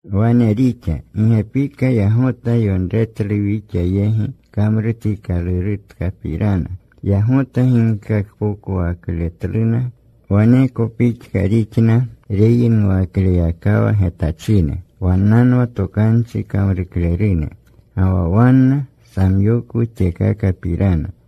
Wane rixa. Gi gepika yagota yonretlu wixa yegi kamrutikalurutkapirana. Yagota ginkakpokwakletluna. Waneko pixka rixna reyinuwaklewayakawa getachine. Wannanwa tokanchi kamruklerune. Ga wa wanna samyokwu tyekakapirana.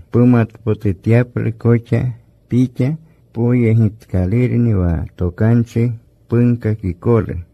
pumatpotutyaplu koxa pixa poyegitkalurni wa tokanchi punkakikolu.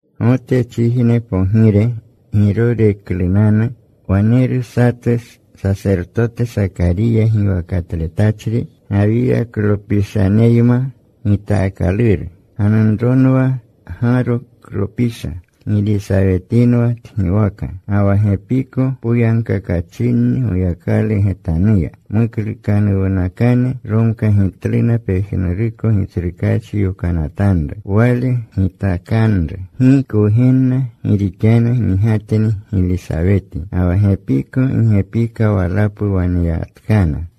Gotechijne pogire Giroreklunanu, waneru satu sasertote, Sakariya giwakatletachri, Gawiyaklopishaneyma gitaakaluru. Ganunronwa Gaaroklopisha. Gilisawetinwa tgiwaka. Ga wa gepiko poyagkakachinni Goyakalu getanuya. Muklukanuwnakane. Romkagitluna pejnuruko Gitsrukaachi yokanatanru, Wale gitakanru. Gi kwugenna gi rixanu migatni Gilisaweti, ga wa gepiko gi gepika walapu waneyanatkana.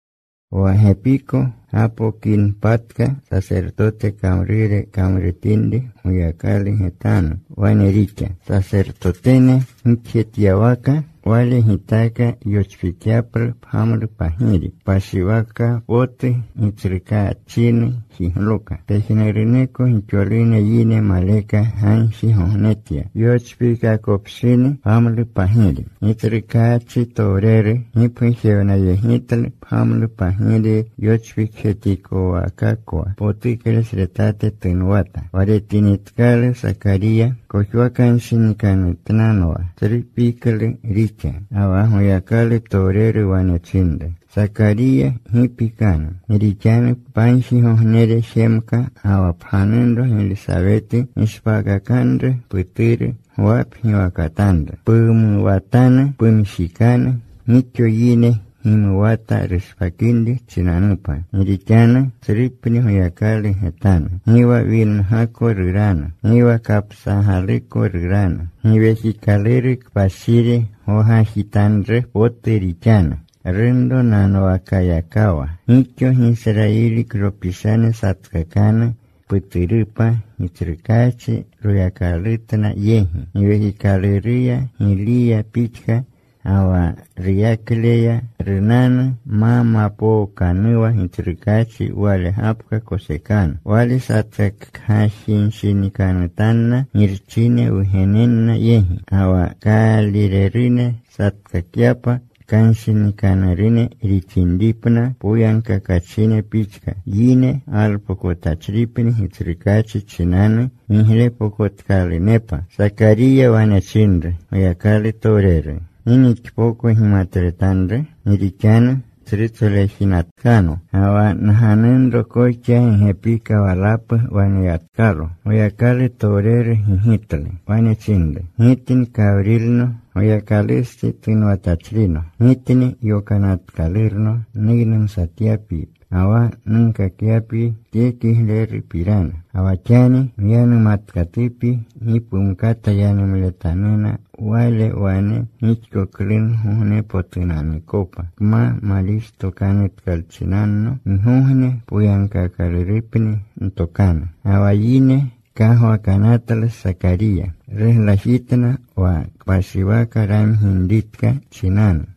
Wa gipapko gapokinpatka sasertote kamrure kamrutinri Goyakalu getanu, wane rixa. Sasertotene gixjetyawaka, wale gitaaka yochpikyaplu pgamlupagiri. Kpashiwaka potu Gitsrukaachinu jigloka. Pejnuruneko gixolune yine maleka gagjigognenatya yochpiikakopshini pgamlupagiri. Gitsrukaachitowreru gipgujewnayegitlu. Pgamlupagiri yochpikjetikowakakwa potuklesretate tunwata. Wa retinitkalu Sakariya, kojwakanshinikanutnanwa. Tsru piklu rixa. Ga wa Goyakalutowreru wane chinru, “Sakariya, gi pikanu. Gi rixanu pagjigognere jemka. Ga wa pganunro Gilisaweti gishpaakakanru puturu. Gwa pgiwakatanru. Pumuwatanu. Pumjikanu. Gixo yine gimuwatanu rushpakinri chinanupa. Gi rixanu tsrupni Goyakalu getanu. Gi wa wingako ruranu. Gi wa kapsagaluko ruranu. Giwekikaluru Kpashiri gwagajitanru potu rixanu, runronanwakyakawa. Gixo Gisrayiliklopishane satkakanu puturupa Gitsrukaachi Royakalutna yegi. Giwekikaluruya, Giliya pixka, ga wa ruyakleya runanu. Ma mapookanuwa Gitsrukaachi, wale gapka kosekanu. Wale satkakgajinshinikanutanna girchine wugenenna yegi; ga wa kaalirerune satkakyapa kanshinikanurune rixinripna poyagkakachine pixka. Yine galpokotachripni Gitsrukaachi chinanu giglepokotkalunepa.” Sakariya wane chinru Goyakalutowreru, “¿Gi nixpoko gimatletanru? Gi rixanu tsrutsolejinatkano. Ga wa nganunro koxa gi gepika walapu waneyatkalo.” Goyakalutowreru gigitlu. Wane chinru, “Gitni Kawrilno. Goyakalustsi tunwatachrino. Gitni yokanatkalurno nuynumsatyapyi, ga wa nunkakyapyi tye kiglerupirana. Ga wa xani myanumatkatupyi. Gi pumkata yanumletannuna wale wane gixkoklugognepotunanukopa, pma malixtokanutkalchinanno. Gigogne poyagkaakalurupni ntokanu.” Ga wa yine kagwakanatlu Sakariya. Ruglajitna wa kpashiwaka ramginritka chinanu.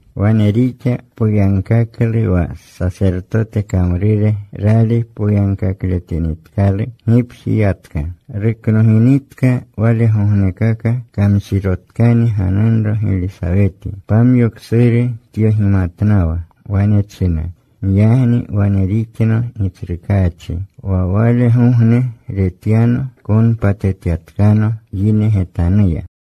Wane rixa. Poyagkaklu wa sasertote kamrure. Rali poyagkakletinitkalu, gipji yatka. Ruknoginitka walegognekaka, kamshirotkani ganunro Gilisaweti. Pamyo ksuru tyogimatnawa. Wane china, “Giyagni wane rixno Gitsrukaachi, wa walegogne retyano konpatetyapatkano yine getanuya.”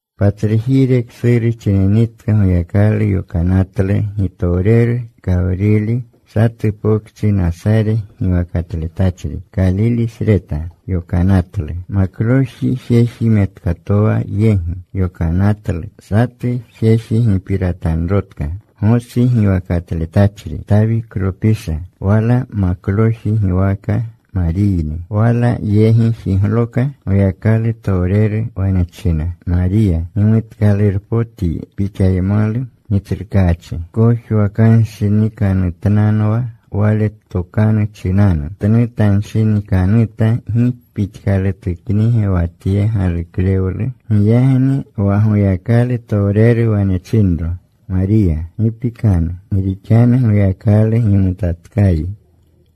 Patsrujire ksuru chininri Goyakalu yokanatlu gitowreru Kawrili. Satu pokchi Nasare giwakatletachri, Kalilesreta, yokanatlu. Makloji jeji metkatowa yegi yokanatlu. Satu jeji gipiratanrotka, Gosi giwakatletachri, Tawiklopisha. Wala makloji giwaka Mariyni. Wala yegi jigloka Goyakalutowreru. Wane china, “Mariya, gimutkalurpotyi. Pixaymalu Gitsrukaachi.” Tkojwakanshinikanutnanwa wale tokanu chinanu. Tnutanshinikanuta gi pixkalutuknige wa tye galuklewlu. Giyagni wa Goyakalutowreru wane chinro, “Mariya, gi pikanu. Gi rixanu Goyakalu gimutatkayi.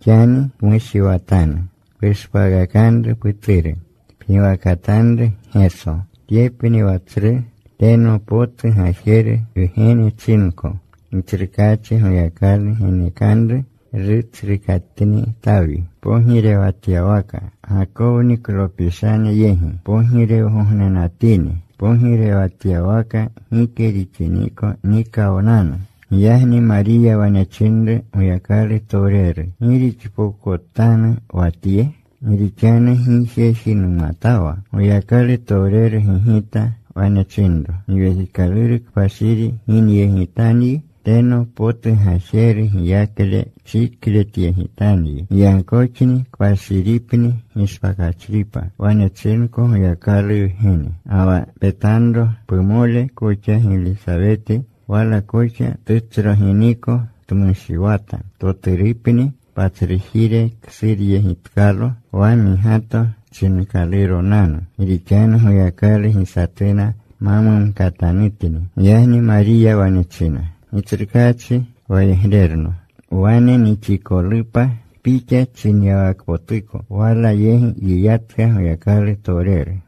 Xani pmushiwatanu. Pushpaakakanru puturu. Pgiwakatanru Geso. Tyepni wa tsru. Teno potu Gajeru Wgene chinko. Gitsrukaachi Goyakalu genekanru rutsrukatni Tawi pogirewatyawaka. Gakowniklopishane yegi pogirewgognenatini. Pogirewatyawaka gike rixiniko nikawnanu.” Giyagni Mariya wane chinru Goyakalutowreru, “¿Gi rixpokotanu wa tye? Gi rixanu gi jeji numatawa.” Goyakalutowreru gigita. Wane chinro, “Giwekikaluru Kpashiri ginyegitanyi. Teno potu Gajeru giyakle chikletyegitanyi. Giyagkoxni kpashiripni gishpakachripa wane chinko Goyakalu Wgene. Ga wa petanro. Pumole koxa Gilisaweti wala koxa tutsroginiko tmushiwata. Toturupni. Patsrujire ksuryegitkalo wa migato chinkaluronanu. Gi rixanu Goyakalu gi satuna ma mumkatanutni.” Giyagni Mariya wane china, “Gitsrukaachi wayegrerno. Wane nixikolupa pixa chinyawakpotuko.” Wala yegi yiyatka Goyakalutowreru.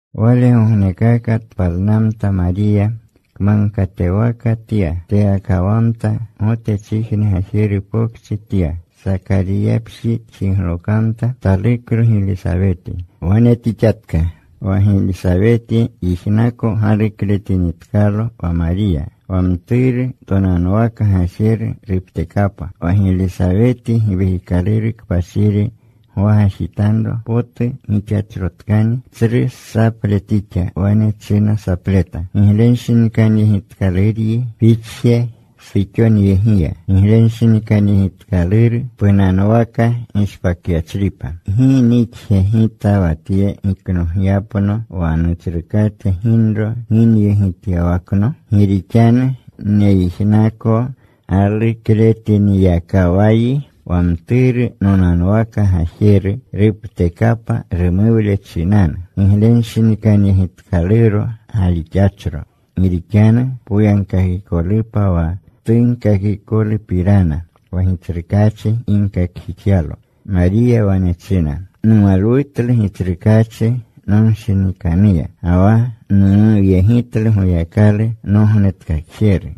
Walegognekaka tpalnamta Mariya. Kmagkatewaka tya. Teyakawamta. Gotechijne gajeru pokchi tya. Sakariyapji tjiglokamta. Taluklo Gilisaweti. Wane tixatka. Wa Gilisaweti yijnaka galukletinitkalo wa Mariya, wa mturu tonanwaka gajeru ruptekapa. Wa Gilisaweti Giwekikaluru Kpashiri gwagajitanro potu gixachrotkani. Tsru saple tixa. Wane china sapleta, “Giglenshinikanyegitkaluryi pixje suxonyegiya. Giglenshinikanyegitkaluru punanwaka gishpakyachripa. ¿Gi nixge gita wa tye giknogyapno, wa Nutsrukate ginro ginyegityawakno? Gi rixanu neyijnako galukletiniyakawayi, wa mturu nonanwaka gajeru ruptekapa rumuwle chinanu. Giglenshinikanyegitkaluro galixachro, gi rixanu poyagkakikolupa wa tunkakikolupirana, wa Gitsrukaachi ginkakjixyalo.” Mariya wane china, Numalwutlu Gitsrukaachi nonshinikanuya. Ga wa numuwyegitlu Goyakalu, Nognetkakjeru.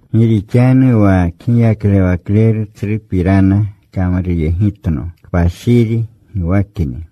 Gi rixanu wa Kgiyaklewakleru tsrupirana kamruyegitno. Kpashiri giwakni.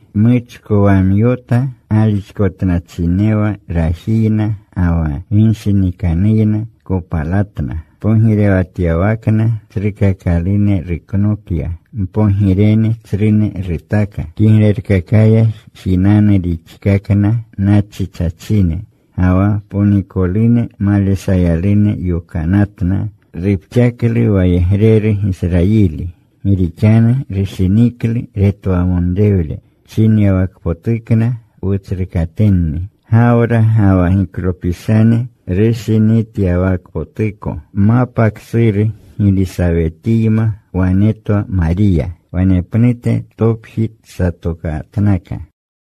Muchkowamyota. Galixkotnachinewa rajiyna ga wa ginshinikanuyna kopalatna. Pogirewatyawakna tsrukakalune ruknokya. Mpogirene tsrune rutaka. Kiglerkakaya jinanu rixkakna nachichachine. Ga wa ponikolune maleshayalune yokanatna. Rupxaklu wayegreru Gisrayili, gi rixanu rushiniklu retwamonrewle, Chinyawakpotukna wutsrukatenni, Gawra ga wa giklopishane rushinityawakpotuko. Mapa ksuru Gilisawetiyma wane twa Mariya. Wanepnute topji tsatokatnaka.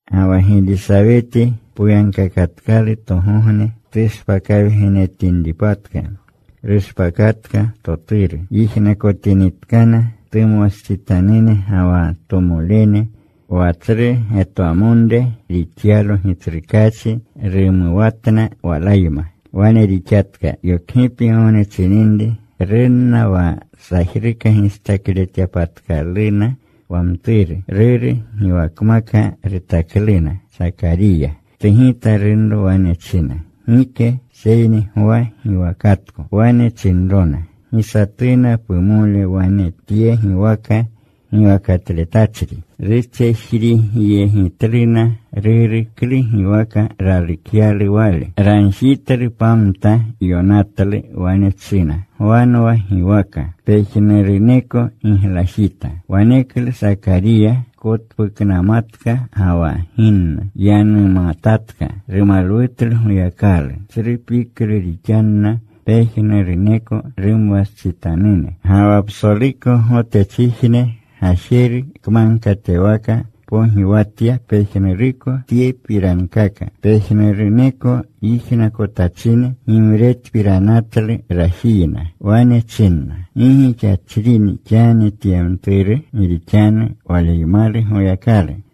Ga wa Gilisaweti poyagkakatkalu togogne tushpakawgenetinripatka, rushpakatka toturu. Yijnakotinitkana tumwastsitanune ga wa tomolene wa tsru getwamonre rixyalo Gitsrukaachi, rumuwatna walayma. Wane rixatka. Yokgipgogne chininri runna wa sajruka gistakletyapatkaluna wa mturu. Ruru giwakmaka rutakluna, Sakariya. Tugita runro. Wane china, “Gike. Seyni Gwa giwakatko.” Wane chinrona, “Gi satuna pumole wane tye giwaka giwakatletachri.” Rutsejrigjeyegitluna ruru klu giwaka ralukyalu wale. Ragjitlu pamta. Yonatlu. Wane china, “Gwanwa giwaka.” Pejnuruneko giglajita. Waneklu Sakariya kotpuknamatka ga wa ginnu. Yanumatatka. Rumalwutlu Goyakalu. Tsru piklu rixanna pejnuruneko rumwastsitanune. Ga wa psoluko Gotechijne gajeru kmagkatewaka pogiwatya pejnuruko tyepirankaka. Pejnuruneko yijnakotachine gimretpiranatlu rajiyna. Wane chinna, “¿Gi gixachrini: xani tye mturu? Gi rixanu waleymalu Goyakalu.”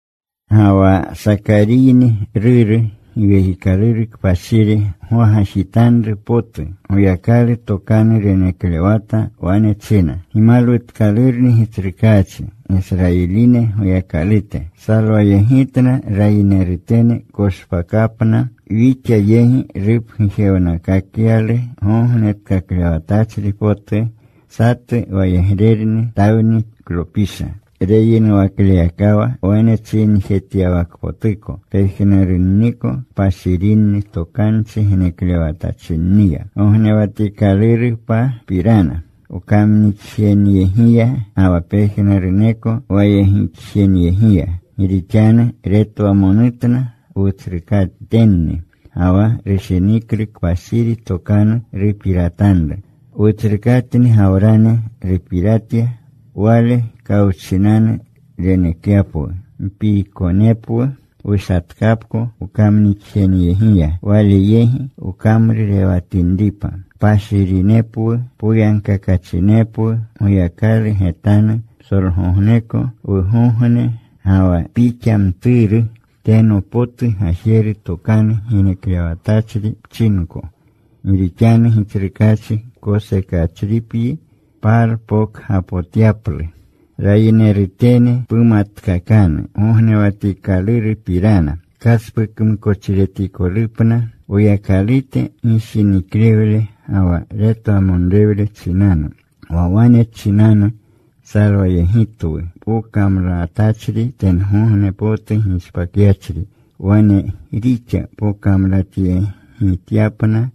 Ga wa Sakariyni ruru, Giwekikaluru Kpashiri gwagajitanru potu. Goyakalu tokanu reneklewata. Wane china: Gimalwutkalurni Gitsrukaachi, Gisrayiline Goyakalute. Salwayegitna rayinerutene koshpakapna. Wixa yegi rupgujewnakakyalu Gognetkaklewatachri potu, satu wayegrerni Tawniklopisha. Reyinuwakleyakawa wane chinjetyawakpotuko pejnurunniko kpashirinni tokanchi geneklewatachinniya, Gognewatikalurupapirana, wkamnixjeneyegiya, ga wa pejnuruneko wayegixjeneyegiya. Gi rixanu retwamonutna wutsrukatenni ga wa rushiniklu kpashiri tokanu rupiratanru. Wutsrukatni Gawrani rupiratya Wale kawchinanu renekyapwu Mpiikonepwu wushatkapko wkamnixjenyegiya, Wale yegi wkamrurewatinripa, Kpashirinepwu, poyagkakachinepwu Goyakalu getanu psolgogneko wugogne. Ga wa pixa, mturu, teno potu Gajeru tokanu geneklewatachri pchinko Gi rixanu Gitsrukaachi kosekachripyi palpokgapotyaplu. Rayinerutene pumatkakanu gognewatikalurupirana kaspukmukochiretikolupna, Woyakalute gishiniklewle ga wa retwamonrewle chinanu, Wa wale chinanu salwayegitwu pokamlatachri tengogne potu gishpakyachri. Wane rixa pokamlatyegityapna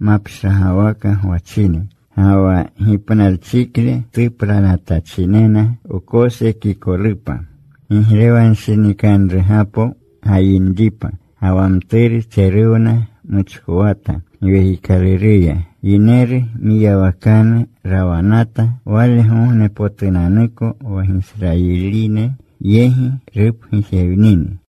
mapshagwaka gwachine, ga wa gipnalchikle tuplanatachinena, wkosekikolupa, giglewanshinikanrugapo gayinripa. Ga wa mturu tseruwna. Muchkowata Giwekikaluruya. Yineru mwiyawakanu rawanata walegognepotunanuko wa Gisrayiline yegi rupgujewnini.